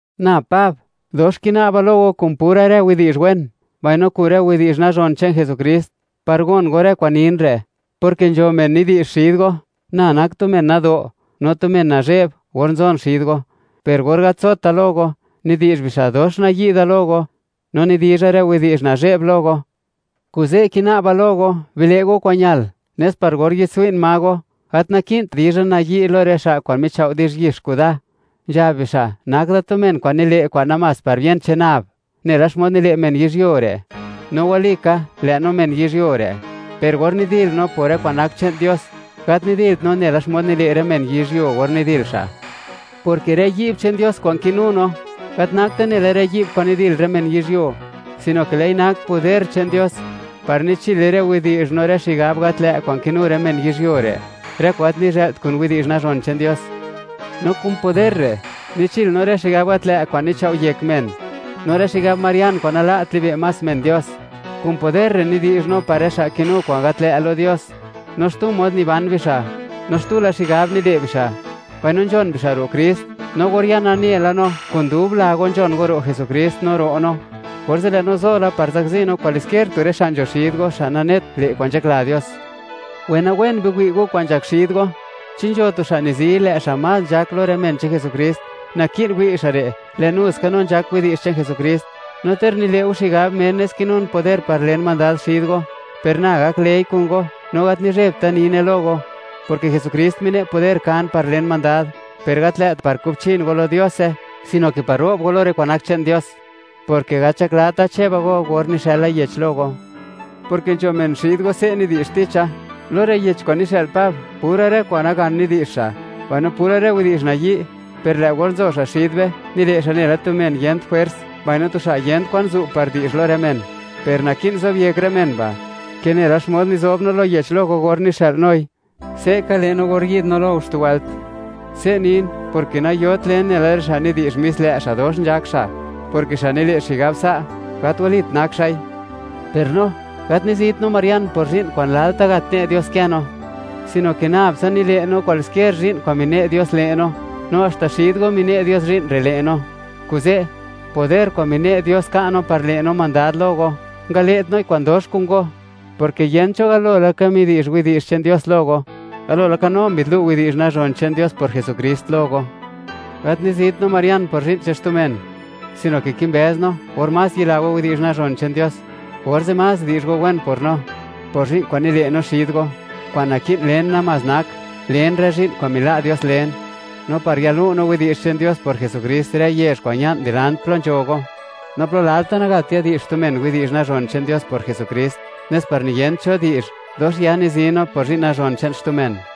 Na Pab, dox kina'ba lo go kun pura rë widi'zh wen, mbaino kun rë widi'zh nazhon che'n Jesukrist, par gon go rë kwa'n nin re', porke nzho men nidi'zh xid go, na nak tu men nado', no tu men nazhe'b or nzon xid go, per or gat nzota lo go, nidi'zh bixa', dox nayi' da lo go, no nidizha rë widi'zh nazhe'b lo go. Kuze' kina'ba lo go, bile' go kwa'n ñal, nes par gor yi'dtswi'n ma go, gat naki'nt dizha nayi' lo rë xa' kwa'n michao' di'zh yix kuda, nzhab bixa', nak da tu men kwa'n nile' kwa'n namás par bien che'n nab, nela xmod nile' men yizhyuo re'. No walika, lë' no men yizhyuo re', per or nidil no por rë kwa'n nak che'n Dios, gat nidilt no nela xmod nile' rë men yizhyuo or nidil xa', porke rë yi'b che'n Dios kwa'n kinu no, gat nakte nela rë yi'b kwa'n nidil rë men yizhyuo, sino ke lë'i nak poder che'n Dios, par nichile rë widi'zh no rë xigab gat lë' kwa'n kinu rë men yizhyuo re', rë kwa'n gat nizhë'lt kun widi'zh nazhon che'n Dios. No kun poder re', nichil no rë xigab gat lë' kwa'n nichao' yek men, no rë xigab marian kwa'n nala't libe' más men Dios. Kun poder re', nidi'zh no par rë xa' kinu kwa'n gat lë' lo Dios, no xtu mod niban bixa', no xtu la xigab nile' bixa', mbaino nzhon bixa' ro' Krist. No gor ya nane la no, kun dub la go nzhon go ro' Jesukrist no ro' no, orze' lë' no zo la par zakzi no kwaliskier tu rë xa' nzho xid go, xa' kwa'n nanet le' kwa'n nzhakla Dios. Wenawen biwi' go, kwan nzhak xid go. Chi nzho tu xa' nizi, lë' xa' más nzhak lo rë men che'n Jesukrist, naki'n wi' xa' re', lë' nu ska no nzhak widi'zh che'n Jesukrist. No ter nile' go xigab, menes kinun poder par len mandad xid go, per na gaklëi' kun go, no gat nizhebta nine lo go, porke Jesukrist mine' poder kan par len mandad, per gat lë't par kubchin go lo Diose, sino ke par ro'b go lo rë kwa'n nak che'n Dios, porke gat nzhaklata, cheba go, or nixëla yech lo go, porke nzho men xid go se' nidi'zh ticha: “Lo rë yech kwa'n nixë'l Pab, pura rë kwa'n nagan nidi'zh xa', mbaino pura rë widi'zh nayi'; per lë' gor nzo xa' xid be, nile' xa' nela tu men yent jwers, mbaino tu xa' yen kwan zu' par di'zh lo rë men.” Per naki'n zobyek rë men ba', ke nela xmod nizob no lo yech lo go or nixë'l noi; se'ka le' no or yi'd no lo go xtu wëlt. Se' nin, porke nayot len nela rë xa' nidi'zh mis lë' xa', dox nzhak xa', porke xa' nile' xigab sa', gat walit nak xa'i. Per no, gat nizit no marian por zhi'n kwa'n lalta' gat ne' Dios kë no, sino ke nab tsa nile' no kwaliskier zhi'n kwa'n mine' Dios le' no, no haxta xid go mine' Dios zhi'n re' le' no. Kuze', poder kwa'n mine' Dios ka' no par le' no mandad lo go, ngale't noi kwa'dox kun go, porke yent cho galo laka midi'zh widi'zh che'n Dios lo go, galo laka no mbi'dlu' widi'zh nazhon che'n Dios por Jesukrist lo go. Gat nizit no marian por zhi'n che'n xtu men, sino ke kimbëz no, or más yila go widi'zh nazhon che'n Dios, orze' más di'zh go wen por no, por zhi'n kwa'n nile' no xid go. Kwa'n naki'n len namás nak, len rë zhi'n kwa'n mila' Dios len, no par yalu' no widi'zh che'n Dios por Jesukrist rë yezh kwa'n ña'n dilant plo nzho go, no plo lalta' nagat yadi'zh xtu men widi'zh nazhon che'n Dios por Jesukrist, nes par niyent cho di'zh, dox ya nizi no por zhi'n nazhon che'n xtu men.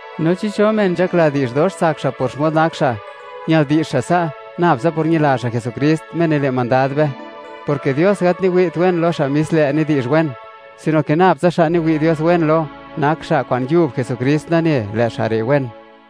No chi cho men nzhakla di'zh dox tsak xa' por xmod nak xa', ñal di'zh xa' sa', nab tsa por ñila xa' Jesukrist, Me nile' mandad be, porke Dios gat niwi't wen lo xa' mis lë' nidi'zh wen, sino ke nab tsa xa' niwi' Dios wen lo, nak xa' kwa'n yub Jesukrist nane, lë' xa' re' wen.